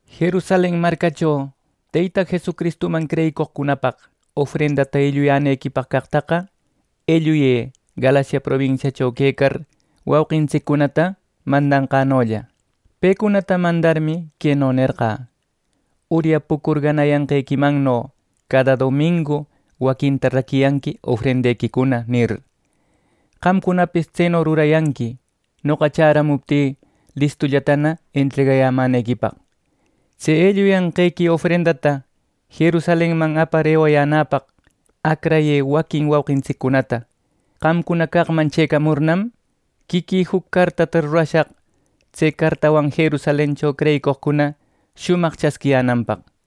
Jerusalen marcacho Teyta Jesucristuman creyicoqcunapaq ofrendata elluyänequipaq caqtaqa “Elluyë Galacia probinsiacho quecar wauqintsiccunata” mandanqänolla. Pecunata mandarmi queno nerqä: “Uryapucur ganayanqequimanno cada domingu waquinta raquiyanqui ofrendequicuna” nir. Qamcunapis tseno rurayanqui noqa chäramuptï listullatana entregayämänequipaq. Tse elluyanqequi ofrendata Jerusalenman apar ewayänanpaq acrayë waquin wauqintsiccunata. Qamcuna caqman chëcamurnam, quiquï juc cartata rurashaq tse cartawan Jerusalencho creyicoqcuna shumaq chasquiyänanpaq.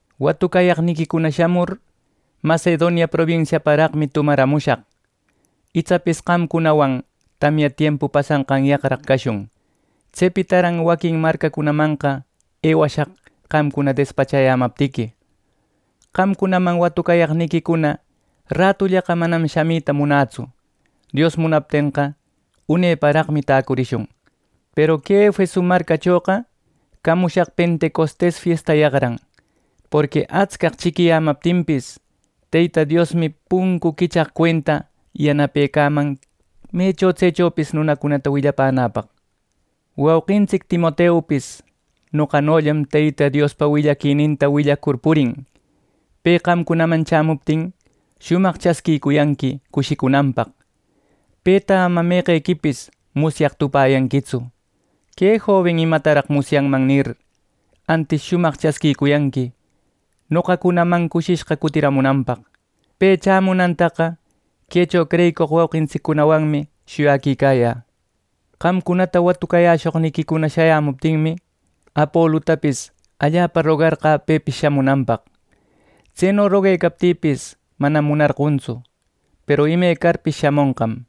Watucaqniquicuna shamur Macedonia probinsiaparaqmi tumamushaq. Itsapis qamcunawan tamya tiempu pasanqanyaqraq cashun. Tsepitaran waquin marcacunamanqa ewashaq qamcuna despachayämaptiqui. Qamcunaman watucaqniquicuna ratullaqa manam shamita munätsu. Dios munaptenqa, uneraqmi täcurishun. Peru que Efeso marcachoqa camushaq Pentecostes fiestayaqran. Porqui atscaq chiquiyämaptinpis, Teyta Diosmi puncu quichaq cuenta yanapecaman mecho tsechopis nunacunata willapänäpaq. Wauqintsic Timoteupis noqanollam Teyta Diospa willaquininta willacur purin. Pe qamcunaman chämuptin shumaq chasquïcuyanqui cushicunanpaq. Peta ama meqequipis musyaq tupäyanquitsu “Que jobin ¿imataraq musyanman!” nir. Antis shumaq chasquiyanqui noqacunaman cushishqa cutimunanpaq. Pe chämunantaqa quecho creyicoq wauqicunawanmi shuyaquicayä. Qamcunata watucayäshoqniquicuna shayämuptinmi, Apolutapis allapa rogarqä pepis shamunanpaq. Tseno roguecaptïpis, manam munarqontsu. Peru imecarpis shamonqam.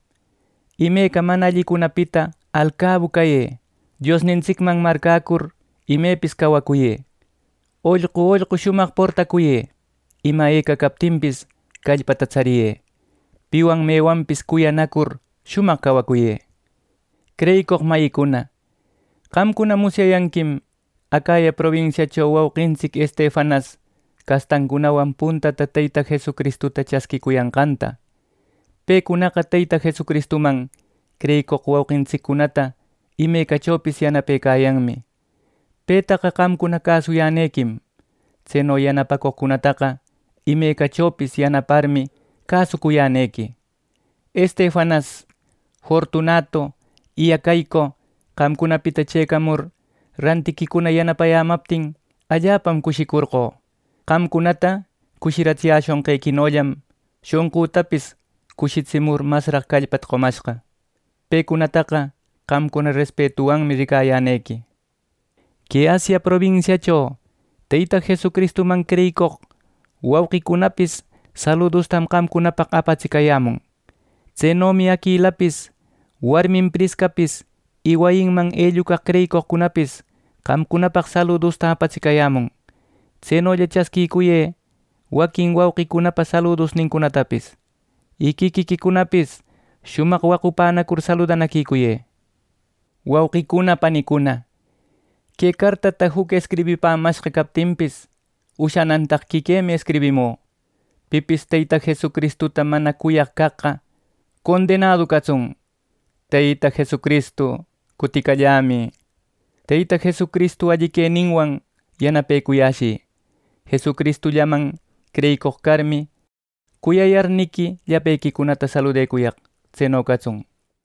Imeca mana allicunapita alcabu cayë. Diosnintsicman marcäcur imepis cawacuyë. Ollqu ollqu shumaq portacuyë, ima eca captinpis callpata tsariyë. Piwan mewanpis cuyanacur shumaq cawacuyë. Creyicoq mayicuna, qamcuna musyayanquim Acaya probinsiacho wauqintsic Estefanas castancunawan puntata Teyta Jesucristuta chasquïcuyanqanta. Pecunaqa Teyta Jesucristuman creyicoq wauqicunata imecachopis yanapecayanmi. Petaqa qamcuna cäsuyänequim. Tseno yanapacoqcunataqa imecachopis yanaparmi cäsuyänequi. Estefanas, Fortunato y Acaico qamcunapita chëcamur rantiquicuna yanapayämaptin allapam cushicorqö. Qamcunata cushiratsiyäshonqequinollam shonqütapis cushitsimur masraq callpata qomashqa. Pecunataqa qamcuna respetuwanmi ricayänequi. Que Asia probinsiacho Teyta Jesucristuman creyicoq wauqicunapis saludustam qamcunapaq apatsicayämun. Tsenomi Aquilapis warmin Priscapis y wayinman ellucayaq creyicoqcunapis qamcunapaq saludusta apatsicayämun. Tsenolla chasquïcuyë waquin wauqicunapa saluduncunatapis. Y quiquiquicunapis shumaq waqupänacur saludanaquicuyë. Wauqicuna panicuna, que cartata juc escribipämashqa captinpis ushanantaqa quiquïmi escribimü. Pipis Teyta Jesucristuta mana cuyaq caqqa condenadu catsun. ¡Teyta Jesucristu cuticallämï! Teyta Jesucristu alli queninwan yanapecuyäshï. Jesucristullaman creyicoq carmi, cuyayarniqui llapequicunata saludecuyaq. ˻Tseno catsun.˼